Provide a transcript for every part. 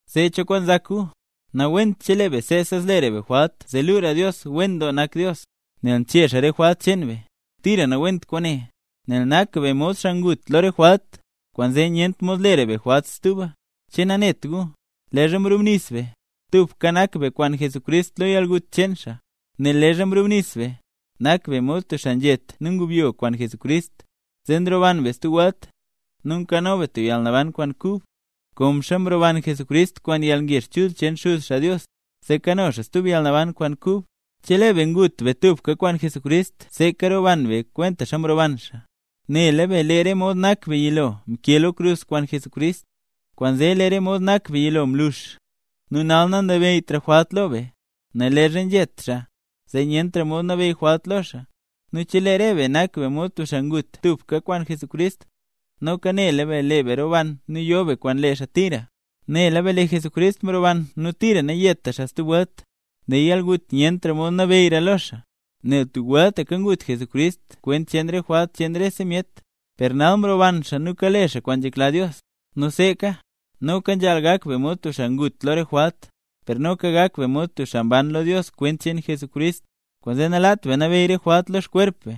Zee, ¿cho kwaan nzak gu? Nawent chelee be seesa zlera be jwalt zee luura Dios wen doo nak, nel nchee xaa re jwalt cheen be. ¡Tira nawent kwaane! Nel nak be mod xaa ngut lo re jwalt; kwaanzee nyent mod lera be jwalt stuba. ¿Che nanet gu, leezha mrubnis be, tubka nak be kwaan Jesucrist lo yalgut cheen xaa? Nel leezha nrubnis be, nak be mod tub xaa nzhet nu nyubyo kwaan Jesucrist, zee nroban be stub welt, nu nkano be tub yalnaban kwaan kub; konxa mroban Jesucrist kwaan yalngezh chul cheen Xuz xaa Dios, zee kano xaa stub yalnaban kwaan kub. Chelee be ngut be tubka kwaan Jesucrist seeka roban be kwentaxa mroban xaa. Nela be lee re mod nak be yilo mkee lo krus kwaan Jesucrist, kwaanzee lee re mod nak be yilo mlux, nu nal nanabeyytra jwalt lo be. Nel leezha nzhet xaa, zee nyentra mod nabeyy jwalt lo xaa. Nu chelee re be nak be mod tub xaa ngut tubka kwaan Jesucrist, noka nela be lee be roban nu yo be kwaan lee xaa tira. Nela be lee Jesucrist mroban nu tira nayetra xaa stub welt. Lee yalgut nyentra mod nabeyyra lo xaa. Nel tub weltaka ngut Jesucrist kwent cheen re jwalt cheen rese myet. Per nal mroban xaa nu kale xaa kwaan nzhekla Dios. Nu seeka, noka nzhaal gak be mod tub xaa ngut lo re jwalt, per noka gak be mod tub xaa mban lo Dios kwent cheen Jesucrist. Kwaanzee, nalaat be nabeyy re jwalt lo xkwerp be,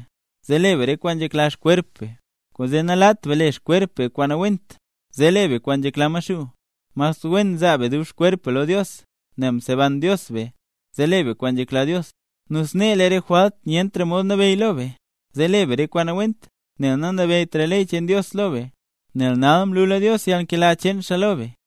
zee le be re kwaan nzhekla xkwerp be. Kwaanzee nalaat be le xkwerp be kwaan nawent, zee le be kwaan nzhekla Maxuu. Mas wen zaa be dub xkwerp be lo Dios, nel mseban Dios be, zee le be kwaan nzhekla Dios. Nu snee lee re jwalt nyentra mod nabeyy lo be, zee le be re kwaan nawent, nel nanabeyytra ley cheen Dios lo be, nel nal mlula Dios yalnkela cheen xaa lo be.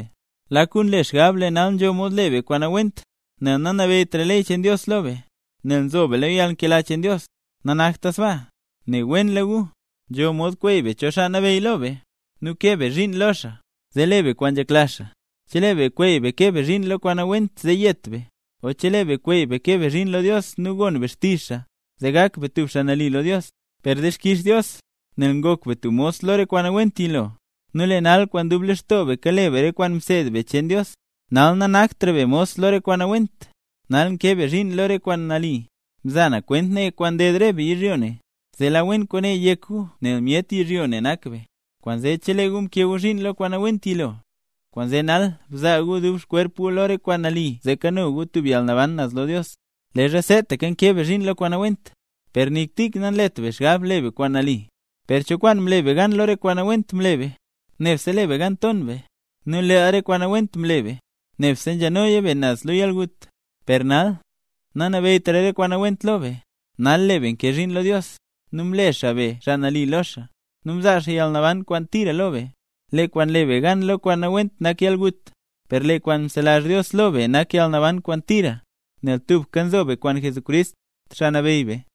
Lak gu nle xgab lee nal nzho mod le be kwaan nawent nel nanabeyytra ley cheen Dios lo be, nel nzo be lo yalnkela cheen Dios. ¡Nanakta sbaa! Ne wenla gu, nzho mod kweey be cho xaa nabeyy lo be, nu kee be zhiin lo xaa, zee le be kwaan nzhekla xaa. Chelee be kweey be kee be zhiin lo kwaan nawent zee yet be, o chelee be kweey be kee be zhiin lo Dios nu gon be xtizh xaa, zee gak be tub xaa nali lo Dios. Per dixkix Dios, nel ngok be mos lo re kwaan nawent yilo, nu lee nal kwaan dub lextoo be kale be re kwaan mseed be cheen Dios. Nal nanaktra be mos lo re kwaan nawent. Nal nkee be zhiin lo re kwaan nali. (Mza na kwent ne, kwaan nded re be yizhyo ne, zee la wen kwaane yek gu nel myet yizhyo ne nak be.) Kwaanzee chelee gu mkee gu zhiin lo kwaan nawent yilo, kwaanzee nal bzaa gu dub xkwerp gu lo re kwaan nali zee kano gu tub yalnaban naz lo Dios. Leezha seetaka nkee be zhiin lo kwaan nawent, per nik tik nanlet be xgab le be kwaan nali. Per, ¿cho kwaan mle be gan lo re kwaan nawent mle be? Nebse mle be gan nton be. Nu lee re kwaan nawent mle be, nebse nzhanoya be naz lo yalgut. Per nal, nanabeyytra re kwaan nawent lo be; nal lee be nkee zhiin lo Dios, nu mle xaa be xaa nali lo xaa, nu mzaa xaa yalnaban kwaan tira lo be. Lee kwaan le be gan lo kwaan nawent nak yalgut, per lee kwaan nzelazh Dios lo be nak yalnaban kwaan tira, nel tubka nzo be kwaan Jesucrist, Xaa Nabeyy be.